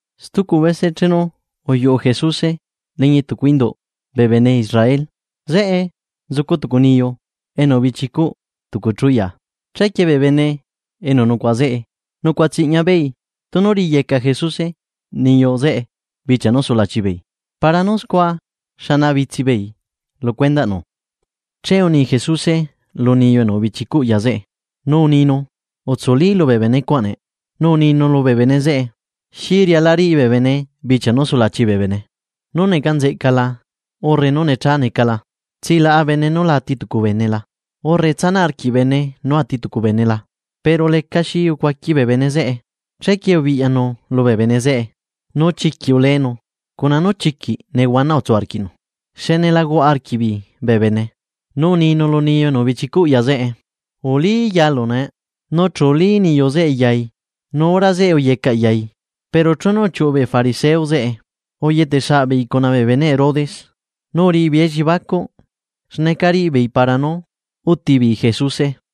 Stucu bese chenu uyuꞌu Jesuse liñi tucu induꞌ bee bene Israel. Zeꞌe nzucu tucu niyu enu ubichicuꞌ tucu chú ya. Chequie bee bene enu nucuaꞌa zeꞌe. Nucuaꞌa tsiꞌña beei tunu riꞌiyeca Jesuse niyu zeꞌe bichia nú sulachi beei, para nú scua xana bitsi beei lu cuendaꞌnu. Che uni Jesuse lu niyu enu ubichicuꞌ ya zeꞌe, nu uninu: ―Utsuli lubee bene cuaꞌ nee. Nu uninu lubee bene zeꞌe: ―¿Xi riala riꞌi bee bene bichia nú sulachi bee bene? ¿Nú neca nzeꞌca la urre nú necha neca la? ¿Tsilaꞌa bene nú la ati tucu bene la, urre tsanaꞌ arquiꞌ bene nú ati tucu bene la? Pero lecaxi ucuaqui bee bene zeꞌe. Chequie ubiꞌyanu lubee bene zeꞌe nu chiquiꞌ uleenu cuna nú chiquiꞌ nehuana utsu arquiꞌnu xne la huaꞌa arquiꞌbeei bee bene, nu uninu lu niyu enu ubichicuꞌ ya zeꞌe: ―Ulí yalu nee. Nu chu ulí niyu zeꞌe yai nu hora zeꞌe uyecaꞌ yai. Pero chenu uchiuꞌu bee fariseo zeꞌe, uyete saꞌ beei cuna bee beneꞌ Herodes nu uriꞌi beei elliebacuꞌ xneca riꞌi beei para nú uti beei Jesuse.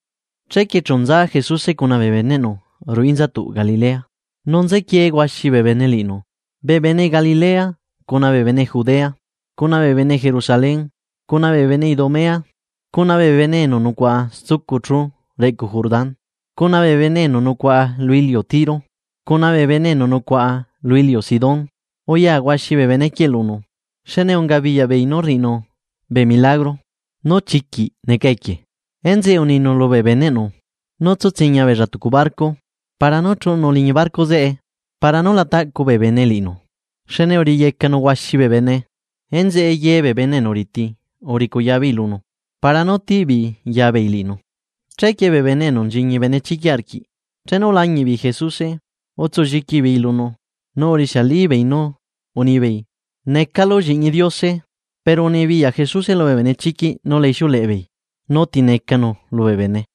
Chequie chu nza Jesuse cuna bee beneꞌnu ruꞌu inzatuꞌ Galilea, nu nzequie huaxi bee bene liꞌinu, bee bene Galilea cuna bee bene Judea, cuna bee bene Jerusalén, cuna bee bene Idumea, cuna bee bene enu nucuaꞌa stucu chú reꞌcu Jordán, cuna bee bene enu nucuaꞌa lu iliu Tiro, cuna bee bene enu nucuaꞌa lu iliu Sidón, uya huaxi bee benequieꞌ lunu, xne unga biyaꞌbeei nú rriꞌinu bee milagro nú chiquiꞌ neca equie. Enzeꞌe uninu lubee beneꞌnu, nú tsu tsiña beella tucu barco para nú chuꞌunu liñi barco zeꞌe, para nú la taꞌcu bee bene liꞌinu. Xne uriꞌiyecanu huaxi bee bene. Enzeꞌe ye bee bene enu riti uricuya beei lunu, para nú tiꞌ beei ya beei liꞌinu. Chequie bee bene enu nchiñi benechiquiꞌ arquiꞌ chenu ulañiꞌ beei Jesuse, utsulliqui beei lunu nu urixialibeei nú unibeei: ―¡Necalu Lliꞌñi Diose! Pero unibiyaꞌ Jesuse lubee benechiquiꞌ nú la ixiuleꞌe beei nú ti necanu lubee bene.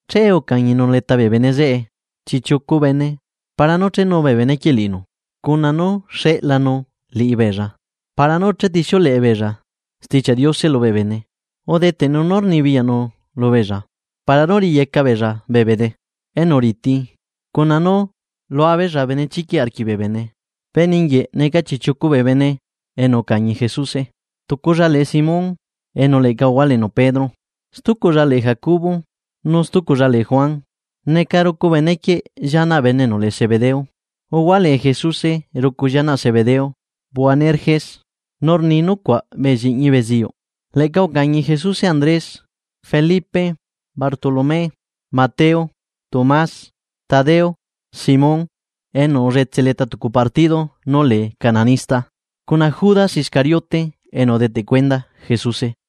Che ucañinu leta bee bene zeꞌe, chiꞌchiucu bene para nú chenu bee benequieꞌ liꞌinu, cuna nú xeꞌlanu liꞌibeella para nú chetixiuleꞌe beella Stichiaꞌ Diose lubee bene. Udeteꞌnu nú rnibiyaꞌnu lubeella para nú riꞌiyeca beella bee bene enu riti cuna nú lua beella benechiquiꞌ arquiꞌ bee bene. Bee ningiueꞌ neca chiꞌchiucu bee bene enu ucañi Jesuse tuculla lee Simón enu leꞌca uhualenu, Pedro. Stuculla lee Jacobo, nu stuculla lee Juan, neca rucu benequieꞌ llianaꞌ bene enu lee Zebedeo. Uhualee Jesuse rucu llianaꞌ Zebedeo, Boanerges, nu rni nucuaꞌ bee lliꞌñi beziyuꞌ. Leꞌca ucañi Jesuse Andrés, Felipe, Bartolomé, Mateo, Tomás, Tadeo, Simón, enu ulletse leta tucu partido nú lee cananista, cuna Judas Iscariote enu udeteꞌ cuenda Jesuse.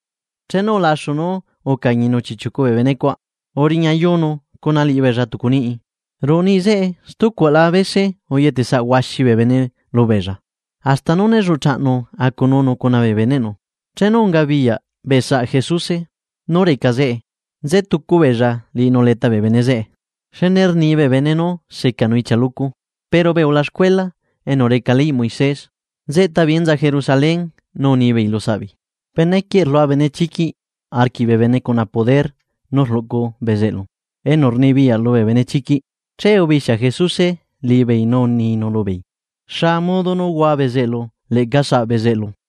Chenu ulaxu nú ucañinu chiꞌchiucu bee benecuaꞌ uriñayunu liꞌibeella ruꞌu tucu niꞌi, ruꞌu niꞌi zeꞌe stucuaꞌla bese uyetesaꞌ huaxi bee bene lubeella. Hasta nú né lluꞌchaꞌnu acununu cuna bee beneꞌnu. Chenu ungabiyaꞌ bee saꞌa Jesuse nú reca zeꞌe. Nzetucu beella liꞌinu leta bee bene zeꞌe, xne rni bee bene nú secanu ichia loco. Pero bee ulaxcuela enu reca leyꞌ Moisés, nzeꞌta beei enza Jerusalén nu unibeei lusaꞌbeei: ―Benequieꞌ rlua benechiquiꞌ arquiꞌ bee bene cuna poder nú rluꞌcu bezeꞌlu enu rnibiyaꞌ lubee benechiquiꞌ. Che ubixia Jesuse liꞌibeei nu uninu lubeei: ―¿Xa modo nú hua bezeꞌlu leꞌca saꞌ bee bezeꞌlu?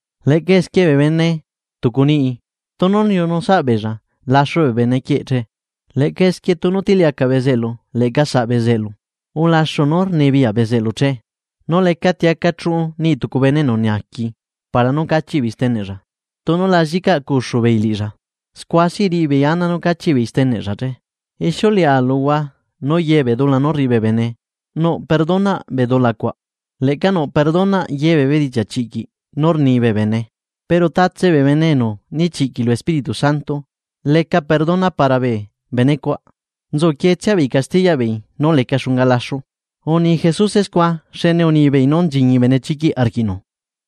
Leꞌca esquie bee bene tucu niꞌi tunu liunu saꞌa beella laxu bee bene quieꞌ che. Leꞌca esquie tunu tiliacaꞌ bezeꞌlu leꞌca saꞌ bezeꞌlu ulaxu nú rnibiyaꞌ bezeꞌlu che. ’Nu lecati aca chuꞌu niꞌ tucu bene enu naaqui para nú cachiꞌ beei steneꞌlla, tunu la llicaꞌcuxu beei liꞌilla. Scua si riꞌi beei ana nú cachiꞌ beei steneꞌlla che. ’Ixiuleꞌa luhua nú ye bee dula nú rriꞌi bee bene, nuꞌ perdonaꞌ bee dula cuaꞌ. Leꞌca nuꞌ perdonaꞌ ye bee bedichiaꞌ chiꞌquiꞌ nú rni bee bene. Pero tatse bee bene enu nichiꞌquiꞌ lu Espíritu Santo, lecaꞌ perdona para bee benecuaꞌ. Nzuquietsia beei castiyaꞌ beei nú leca xunga laxu. Uni Jesuse scua xne unibeei nú nchiñi benechiquiꞌ arquiꞌnu.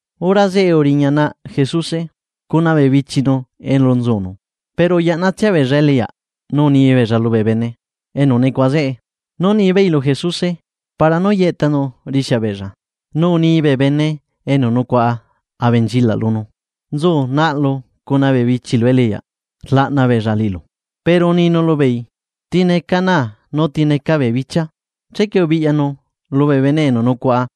Hora zeꞌe uriña naꞌ Jesuse, cuna bee bichinu elu nzunu. Pero uyaꞌnatsia beella eliꞌyaꞌ nu uni beella lubee bene enu nucuaꞌa zeꞌe nú nibeei lu Jesuse para nú yeꞌtanu rixia beella. Nu unibee bene enu nucuaꞌa abenchilaꞌ lunu: ―Nzu naꞌlu cuna bee bichilu eliꞌyaꞌ rlaꞌna beella liꞌilu. Pero uninu lubeei: ―¿Ti neca naa nu ti neca bee bichia? Chequie ubiꞌyanu lubee bene enu nucuaꞌa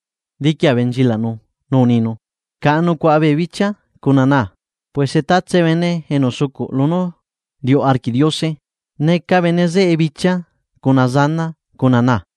diqui abenchilaꞌnu nu uninu: ―Caꞌa nucuaꞌa bee bichia cuna naa. Puese tatse bene enu sucuꞌ lunú riuꞌ arquiꞌ Diose, neca bene zeꞌe bichia cuna zanaa cuna naa.